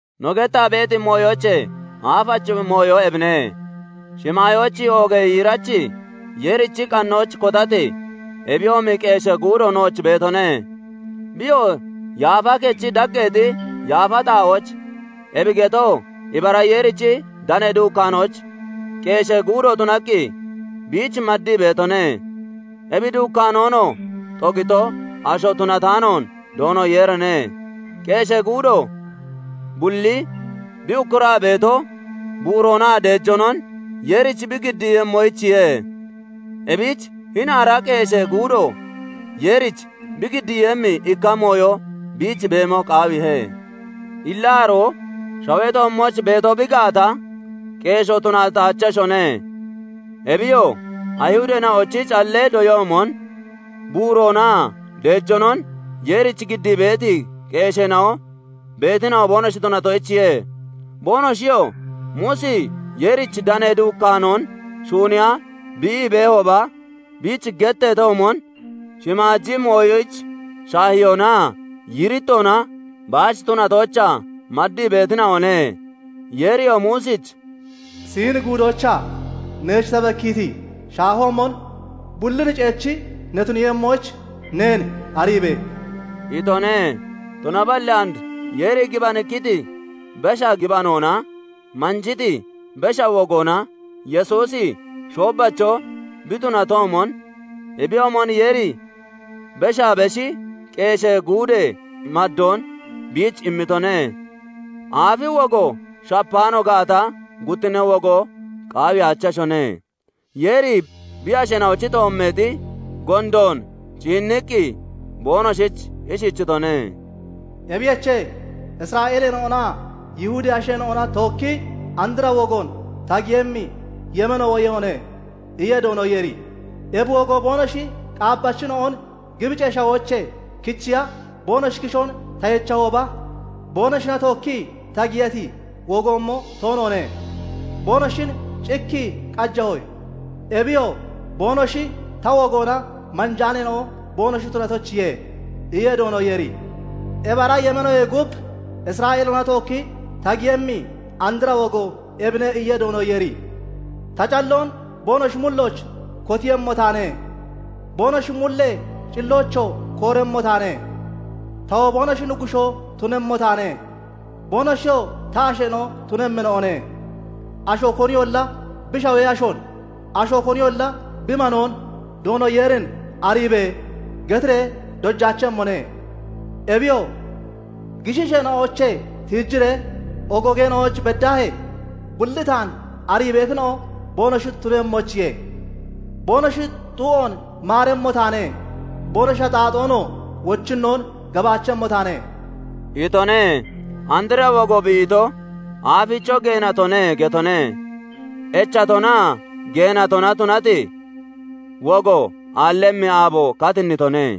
No gettaa beeti mooyoochee aafachi mooyo ebine:- Shimaayooch oogee yiirachi Yeerichi qannooch kotati, ebiyoomi qeeshee guudo nooch beetone; biyoo yaafa kechi daggeexi yaafa xaa'ooch, ebi getoo ibara Yeerichi danee duukkaanooch, qeeshee guudo tunaqqi biich maddii beetone; ebi duukkaanoonoo xogito asho tunataanoon Doono Yeerine. Qeeshee guudo bulli bi ukkuraa beeto buuroonaa deejoonon Yeerich bi giddiiyemmoyichiye; ebich hini ara qeeshee guudo Yeerich bi giddiiyemmi ikka mooyo biich beemo qaawiihe. Illa aroo shawee toommooch beeto bi gaata, qeeshoo tunataacheshone; Ebiyoo, Ayihudeena'ochi callee doyoomon buuroonaa deejoonon Yeerich giddii beeti qeesheena'o beetina'o boonoshi tunatoyichiye. Boonoshiyoo Muusi Yeerichi danee duukkaanoon shuuniya bi ii beehooba biich getteetoomon, shimaaji mooyoyich shaahiyoonaa yiirittoona baach tunatoochaa maddii beetina'one; Yeeriyoo Muusich "Siini Guudoochaa neech ta bekkiiti shaahoomon bullin ceechi ne tuniiyemmoyich neen ariibe!" itone. Tunaballi and Yeeri gibanikkiti besha gibanoona manjiti besha wogoona Yesuusi shoobbacho bi tunatoomon, ebiyoomon Yeeri beshaa beshi qeeshee guudee maddoon biich immitone. Aafi wogo shapaano gaata, guttinnee wogo qaawiyaacheshone. Yeeri bi asheena'ochi toommeexi gondoon ciinniqqi boonoshich ishichitone:- "Ebiyoche, Isra'eeleena'onaa Yihudee asheena'ona tookki andra wogoon ta giyemmi yemeeno woyemmone iye Doono Yeeri. Ebi wogo boonoshi qaabbachina'on Gibicee Shawoochee kichiya boonoshi kishoon ta yechahooba, boonoshina tookkii ta giyati wogoomo toonoone. Boonoshin cikkii qajahoye; Ebiyoo, boonoshi ta wogoona manjaaneena'o boonoshi tunatoyichiye iye Doono Yeeri. Ebi ara yemeenoyee gub Isra'eeleena'ona tookki ta giyemmi andra wogo ebine iye Doono Yeeri:- Ta calleena'on boonoshi mullooch kotiiyemmo taane; Boonoshi mullee cilloochoo kooremmo taane; Tawoo boonoshi Nuggushoo tunemmo taane; Boonoshiyoo ta asheena'o tunemmina'one. Asho koniyolla bi shawee ashoon, asho koniyolla bi manoon 'Doono Yeerin ariibe!' getiree dojaachemmone. Ebiyoo, gishiisheena'oochee tiijiree ogoogeena'ooch beddaahee, Bulli taan arii beetina'o boonoshi tunemmoyichiye. Boonoshi xu'oon maaremmo taane; Boonoshi axaaxoonoo wochinnoon gabaachemmo taane" itone. Andra wogo bi ito, "Aaficho geenatone" getone. Echatonaa geenatona tunati wogo aallemmi aabo katinnitone.